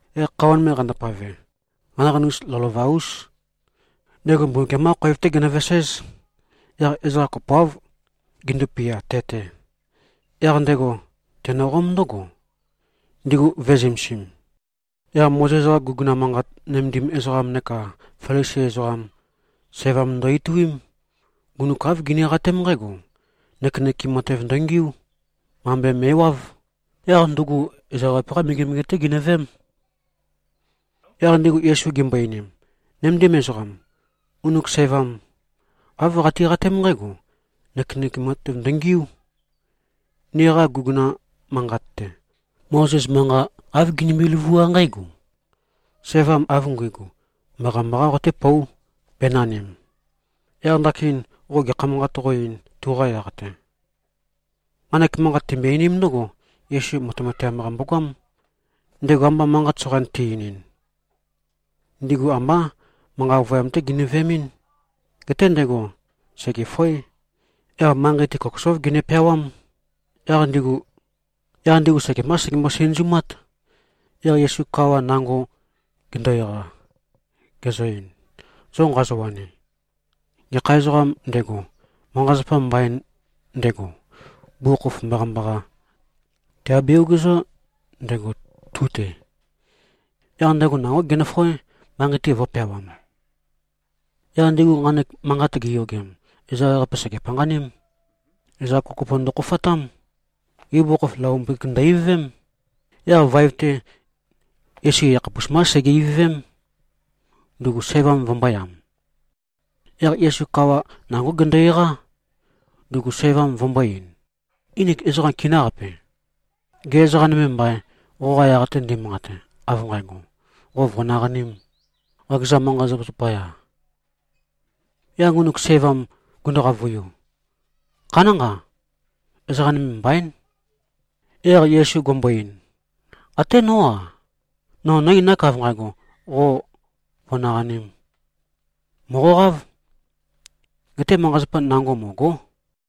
Yaq khøuwa nøme qandopave. Qanaqanus lovølova-ús. Ndego Mbumbukiam-qá khoev-té genøveséz. Yaq ezoqa kopoáv, gindupia, te-te. Yaq ndego tenøqóm ndǿgo, ndigu vø̄e-zømesim. Yaq Mozes-qa guguna manqat nømendim ezoqam neka Felisi ezoqam, sævam ndo-ituím. Ngunuk āv giniqatém nqǽgo, nøkenøkem matev ndøngiú. Mambe me꞉wáv. Yaq ndugu ezoqa ewaqape-qá megemege-té ginøveém. Yaq ndigu Yesu gimbo-einim, “Nøméndim ezoqam. Ngunuk sævam āv qatiqatém nqǽgo, nøkenøkem matev ndøngiú. Niqa guguna manqat-te, Mozes manqa āv ginimbi-løvuá nqǽgo, ‘Sævam av nguigu, mbaqambaqá qotépóu, bēnanim.’ Yaq ndakin qo gekha manqat qó-eīn, tuqa yaq-te?” Nqanek manqat timbøe-einím ndǿgo, Yesu matemateam-qa mbogoám. Ndego amba manqat soqain te-einin, ndigu ambá manqa ovøyam-té ginø-veemɨ́n. Geté ndego sègefoé. Yaq manqei-te kokosóv gene-peawám. Yaq ndigu sekembá segembo-sinøzumát. Yaq Yesu kawa nango gendo-eqa, gezø-ein, “Zo nqazowani, gekha ezoqām ndego, manqa-zapa mbain ndego, bugukhokhof mbaqambaqa tèabe-ogezó ndego, tu-te.” Yaq ndego nangó genøfoé, manqei-te vø̄peawam. Yaq ndigu nqanek manqat giyogem, ezoqa ewaqape sège-panqaním. Ezoqa kopokopo ndøkhofatám. Ibugukhokhof, laombøkik ndø-ivøvém. Yaq vaev-te, Yesu yakhapus mbá sege-ivøvém, ndugu sævam vømbōyam. Yaq Yesu kawa nangó gendo-eqá, ndugu sævam vø̄mbo-ein, “Nginik ezoqam kinǿqapi? Gê, ezoqa nøme mbaîn, qoqa yaq-te ndimanqate, av nqægo, qo vø̀naqanīm, qakeza manqa-zapa zapaya?” Yaq ngunuk sævam gundu-qavøiu, “Khanánqa. Ezoqam nøme mbaín.” Yaq Yesu gumbo-ein, “Até nó-a, no nǿ-einák, av nqægo, qo vø̀naqanīm. Mòqoqáv. Geté manqa-zapa nango mø̀go᷄.”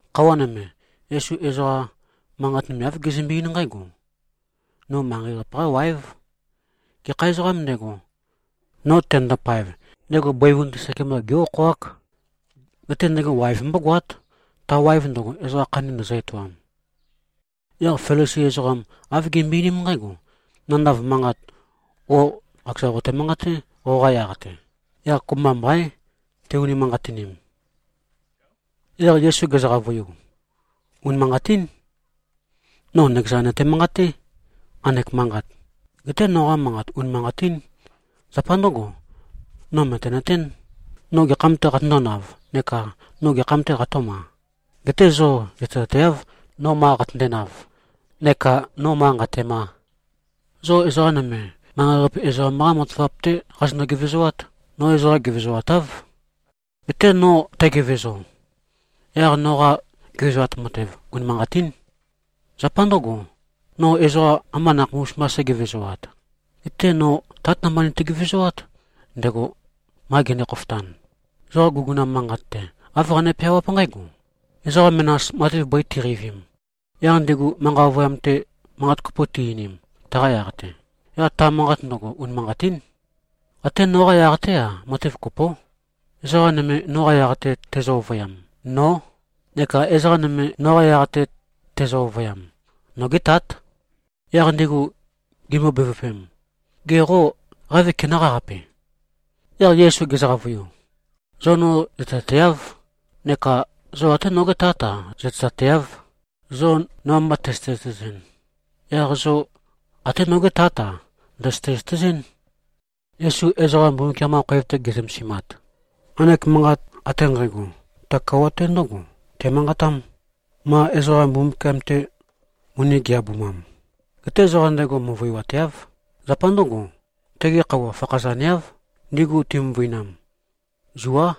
Khøuwa nøme, Yesu ezoqa manqat nøme āv gezømbe-eín nqǽgo, “No manqei-qape-qá wáev. Gekha ezoqām ndego, no tenøndo-paev, ndego bøivun-te sekemba gé-okhoák. Geté ndego waev mbógoát, ta waev ndøgo, ezoqa khandi ndøzø-etoam.” Yaq Felisi ezoqam, āv gimbøe-einím nqǽgo, “Nandav manqat, qo qakeza qote-manqaté, qoqa yaq-te. Yaq kopømba mbaín, tei-unimanqatinim.” Yaq Yesu gezø-qavøiu, “Unimanqatín. No nøkeza nøte-manqaté, nqanek manqat. Geté, noqa manqat unimanqatín. Zapa ndǿgo, no mø̀tenøtén, no gekham-tē qatøndōnav neka no gekham-tē qatø̄ma. Geté zo zøtezateáv, no ma qatøndenav neka no ma nqatēma. Zo ezoqa nøme, manqei-qape ezoqam-qá matavap-té qazonø-gevezoát. No ezoqa gevezoatáv. Geté no tægevezo, yaq noqa gevezoat matev unimanqatín. Zapa ndǿgo, no ezoqa ambá nakhapus mbā sǣgevezoat. Geté no Tát namba niti-gevezoát, ndego ma gende-khofotan. Zoqa guguna manqat-te, āv qane-peawáp nqǽgo: Ezoqa menas matev bøi ti꞉qeivim, yaq ndigu manqa ovøyam-te manqat kopo ti-einim taqa yaq-te, yaq ta manqat ndøgo, unimanqatín. Até noqa yaq-té-a, matev kopó. Ezoqa nøme, noqa yaq-te tezø-ovøyam, nó, neka ezoqa nøme, noqa yaq-te tezø-ovøyam, nogé Tát.” Yaq ndigu gimbo-bevøpem, “Ge qô, qave kenøqáqape?” Yaq Yesu gezø-qavøiu, “Zo no zøtezateáv, neka zo até nogé Tát-a, zøtezateáv. Zo no amba tøzøte-zøtezɨn, yaq zo até nogé Tát-a, ndøzøte-zøtezɨ́n.” Yesu ezoqa Mbumbukiam-qa khoev-te ge꞉zømezimat, nqanek manqat ate nqægo ta kouwat-te ndǿgo temanqatám, ma ezoqa Mbumbukiam-te moni gi꞉-abumam. Geté ezoqa ndego møvøiwateáv. Zapa ndǿgo, tege khøuwa fakhazaneáv, ndigu ti꞉møvøinam. Zuá.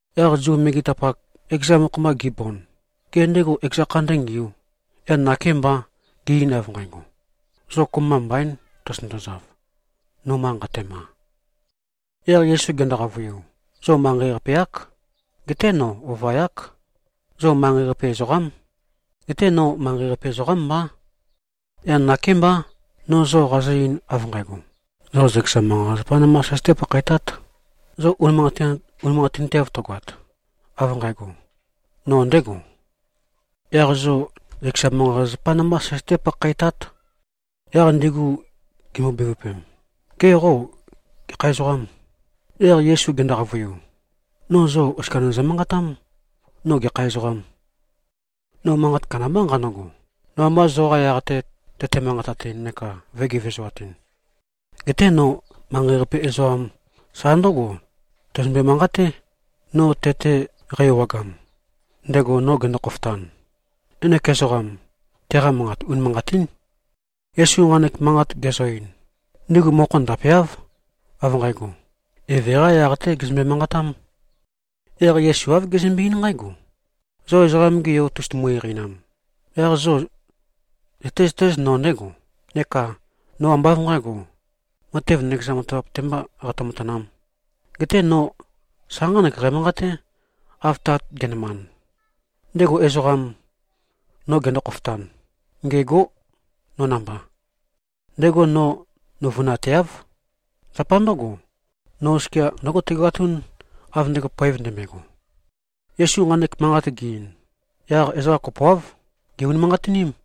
Yaq Zu megetapak, ekeza mokho-mba gibond, “Gê, ndego ekeza kha ndǿngiū, yaq nakêmbà, ge꞉-ein av nqægo, ‘Zo kopømba mbaīn, tozotøndozav, no ma nqatema.’?” Yaq Yesu gendo-qavøiu, “Zo manqei-qape-ák. Geté no ova-yák. Zo manqei-qape ezoqám. Geté no manqei-qape ezoqám mbá. Yaq nakémbá, no zo qazø-ein av nqægo, zo zøkeza manqa-zapazapā nambā søzøtē-pakhaetāt. Zo unimanqatinteav tøgoat, av nqægo, no ndēgo, yaq zo zøkeza manqa-zapazapá nambá søzøté-pakhaetát.” Yaq ndigu gimbo-bevøpem, “Gê, qo gekha ezoqâm?” Yaq Yesu gendo-qavøiu, “No zo oskia nøzø-manqatám, no gekha ezoqām. No manqat kandambá nqanøgo, no amba zoqa yaq-te tøte-manqatatɨn neka vø̄e-gevezoatɨn. Geté no manqei-qape ezoqam sa ndǿgo tæzømbe-manqaté, no te-te qæ-ewagam, ndego no gendo-khofotan. Ngenek ezoqam, teqa manqat unimanqatín.” Yesu nqanek manqat gezø-ein, ndigu mokho ndapeáv, av nqægo, Eve-qā yaq-tē gezømbe-manqatām. Yaq Yesu āv gezømbe-eín nqǽgo, “Zo Ezoqam-ge Yo tozotumu-eqeinam, yaq zo zøtézøtéz, no ndégo, neka no ambá av nqǣgo, matev nøkeza matavap-te mbā qatø-matanām. Geté no sa nqánek qæmanqaté, av Tat ge꞉nømand. Ndego ezoqam, no gendo-khofotan, ngêgó no namba. Ndego no nøuvønateáv. Zapa ndǿgo, no oskia ndǿgo tægoatún, av ndego poev ndømbøego.” Yesu nqanek manqat ge-ein, yaq ezoqa kopoáv gè-unimanqatiním.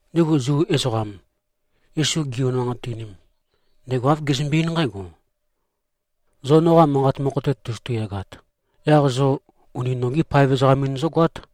Ndigu Zu ezoqam, Yesu gi-unimanqatinim, ndego āv gezømbe-eín nqǽgo, “Zo noqa manqat mokho-te tozotu-yagat, yaq zo uni nogí paev ezoqam-in zógoát.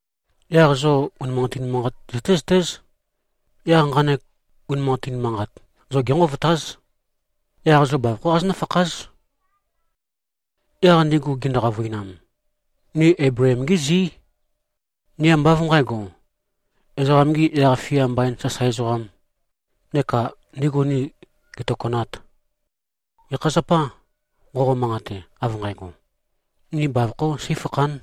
Yaq zo unimanqatin manqat zøtézøtéz. Yaq nqanek unimanqatin manqat, zo génqovotáz. Yaq zo bavokhó qazonǿ-fakház.” Yaq ndigu gindu-qavøinam, “Ni Eibleem-gí zí. Ni ambá av nqǣgo, ezoqam-gī yaq-fia mbain sasae ezoqām, neka ndigu ni gètokønāt. Gekha zapâ, nqoqo-manqate av nqægo, ni bavokho seīfakhān?”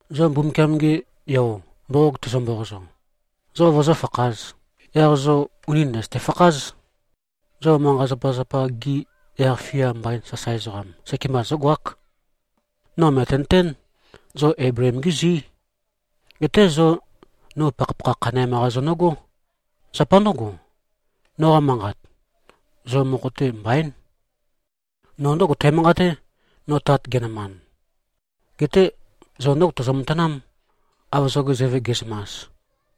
Zo Mbumbukiam-ge Yo mboqog tezø-mboqozo, zo vozófakhāz, yaq zo ùni ndøzøte-fakház. Zo manqa-zapazapa-gi yaq-fia mbain sasae ezoqam, sekemba zógoák. No mø̀tenøtén, zo Eibleem-gí zí. Geté zo no pakhapakha khaneam-qa zonøgó. Zapa ndǿgo, noqa manqat, zo mokho-te mbaín. No ndǿgo tæmanqaté, no Tat ge꞉nømand. Geté zo ndǿgo tozo-matanám, av zoge zøve ge꞉zømas.”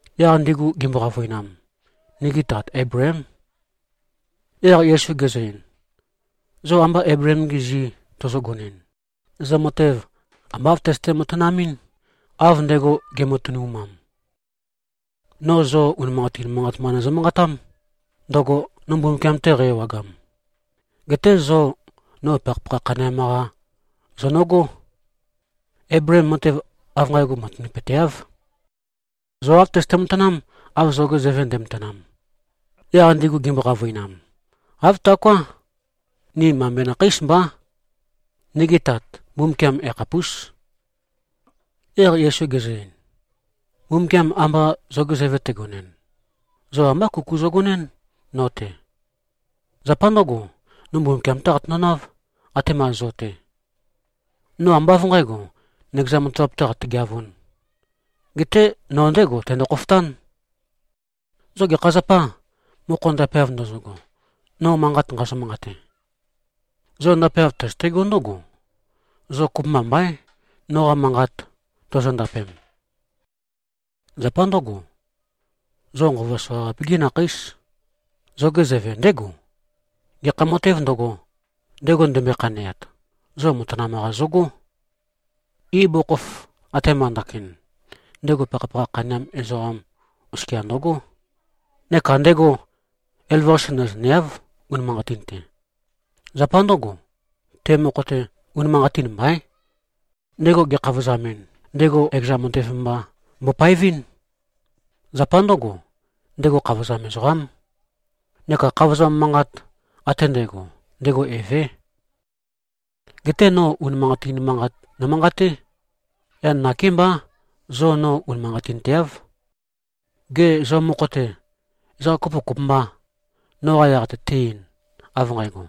Yaq ndigu gimbo-qavøinam, “Nigi tat Eibleém.” Yaq Yesu gezø-ein, “Zo amba Eibleem-gi zi tozogonɨn, zo matev amba āv tøzøte-matanamɨ́n, av ndego ge꞉matønumam. No zo unimanqatin manqat mba nøzø-manqatám, ndøgo no Mbumbukiam-te qæ-ewagam. Geté zo no pakhapakha khaneam-qa zonøgó. Eibleem matev av nqægo matanapøteáv. Zo āv tøzøte-matanám, av zoge zøve nde꞉matanam.” Yaq ndigu gimbo-qavøinam, “Āv taoká. Ni mambe nakheís mbá. Nigi Tat, Mbumbukiam yakhapús.” Yaq Yesu gezø-ein, “Mbumbukiam amba zoge zøve tegonɨn, zo ambá kuku zogonɨ́n no-te. Zapa ndǿgo, no Mbumbukiam-té qatøndonáv, atema zo-te. No ambá av nqǣgo, nøkeza matavap-tē qatøgeavūn. Geté no ndégo tendo-khofotán. Zo gekha zapâ, mokho ndapeav ndozogo, no manqat nqazø-manqate? Zo ndapeav tøzøtegó ndǿgo, zo kopømba mbaín, noqa manqat tozondapem. Zapa ndǿgo, zo nqova soqaqape-gí nakheís. Zoge zøve ndégo. Gekha matēv ndøgo, ndego ndømbøe-khaneat, zo matanam-qa zogó. Ibugukhokhof, atema ndakin, ndego pakhapakha khaneam ezoqam oskia ndøgó, neka ndego elavøqase nøzøneáv unimanqatin-te. Zapa ndǿgo, te mokho-te unimanqatin mbaín. Ndego gekhavozamɨn, ndego ekeza matev mba mbopaevɨ́n. Zapa ndǿgo, ndego khavozam ezoqám neka khavozam manqat ate ndægo, ndego evé. Geté no unimanqatin manqat nomanqaté. Yaq nakémbá, zo no unimanqatinteáv. Gê, zo mokho-te, ezoqa kopo kopømbâ, noqa yaq-te te-ein, av nqægo,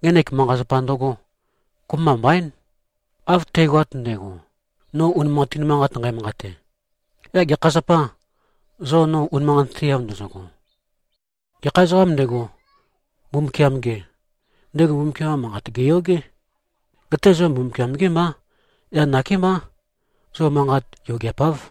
ngenek manqa-zapa ndøgō. Kopømba mbaín. Av tægoat ndægo, no unimanqatin manqat nqæmanqate, yaq gekha zapâ, zo no unimanqatinteav ndozogo? Gekha ezoqām ndego, Mbumbukiam-gē, ndego Mbumbukiam-qa manqat gèyogé. Geté zo Mbumbukiam-gé mbá. Yaq nakémbá, zo manqat yogeapáv.”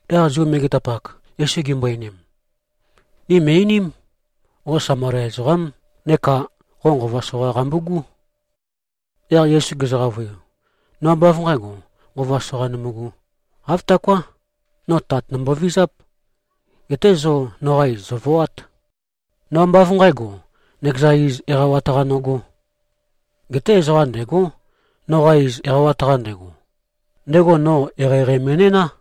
Yaq Zu megetapak, Yesu gimbo-einim, “Ni mø̀i-einím. Qo Samalia ezoqám. Neka qo nqova soqa qambugú.” Yaq Yesu gezø-qavøiu, “No ambá av nqǣgo, nqova soqa nømbugū. Āv taoká. No Tat nombovizáp. Geté zo noqa iz, zòvoát. No ambá av nqǣgo, nøkeza iz eqawat-qa nogó. Geté ezoqa ndêgó, noqa iz eqawat-qa ndego. Ndego no eqeieqei me꞉næná.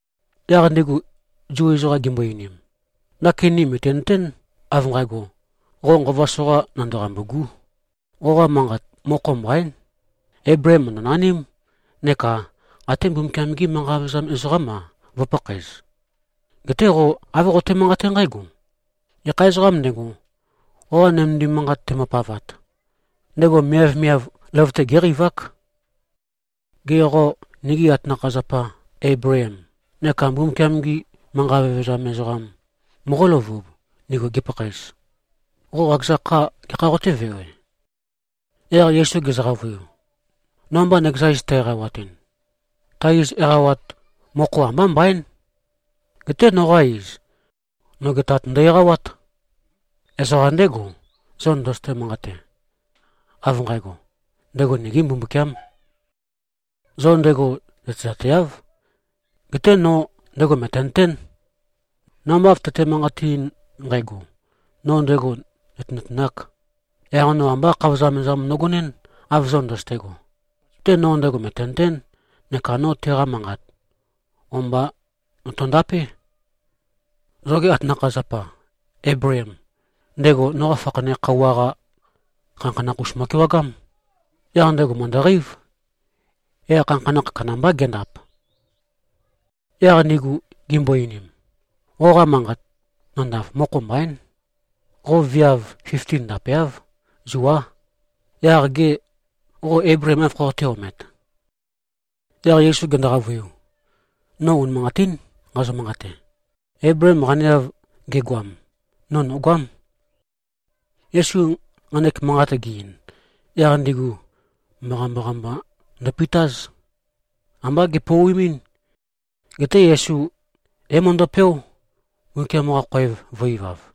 Yaq ndigu Zu ezoqam gimbo-einim, “Ndakin ni mø̀tinøtén, av nqægo, qo nqova soqa nandeqambû꞉gú! Qoqa manqat, mokho mbaín. Eibleem mø̀ndønaním neka até Mbumbukiam-gi manqa vevezam ezoqám-a, vø̄pakhaez. Geté qo āv qoqote-manqaté nqǽgo: Gekha ezoqām ndego, qoqa nømendim manqat tembopavat, ndego miavmiav løvøte géqeivák. Gê, qo nigi atanakha-zapa Eibleem neka Mbumbukiam-gi manqa vevezam ezoqam, moqóløvub, ndigu gipakhaez? Qo qakeza kha gekha qotévewe?” Yaq Yesu gezø-qavøiu, “No amba nøkeza iz tæ-eqawatɨn, ta iz eqawat mokho ambá mbaín. Geté noqa iz, noge Tat ndø-eqawát. Ezoqa ndégo, zo ndøzøte-manqate, av nqægo, ndego nigī Mbumbukiām. Zo ndego zøtezateáv. Geté no ndego mø̀tenøtén. No amba av tøte-manqateɨn nqægo, no ndego nø̀tenøtenāk, yaq no ambá khavozam ezoqam nogonɨ́n, av zo ndøzøte꞉go. Geté no ndego mø̀tenøtén, neka no teqa manqat o-mba notondapé. Zoge atanakha-zapa Eibleem, ndego noqa fakhane khøuwa-qa khanakhanakh-us mo꞉kewagám. Yaq ndego mø̀ndøqeív. Yaq khanakhanakh kandambá gendap.” Yaq ndigu gimbo-einim, “Qoqa manqat nandav, mokho mbaín. Qo viav fifti ndapeáv. Zuá. Yaq gê, qo Eibleem áv khoqoté-omet?” Yaq Yesu gendo-qavøiu, “No unimanqatín nqazø-manqate. Eibleem qaneav gegoam, no nògoám.” Yesu nqanek manqat ge-ein, yaq ndigu mbaqambaqa mba ndøpitáz. Ambá gepouimín. Geté Yesu é-møndøpeó, Mbumbukiam-qa khoev vø̄-ivav.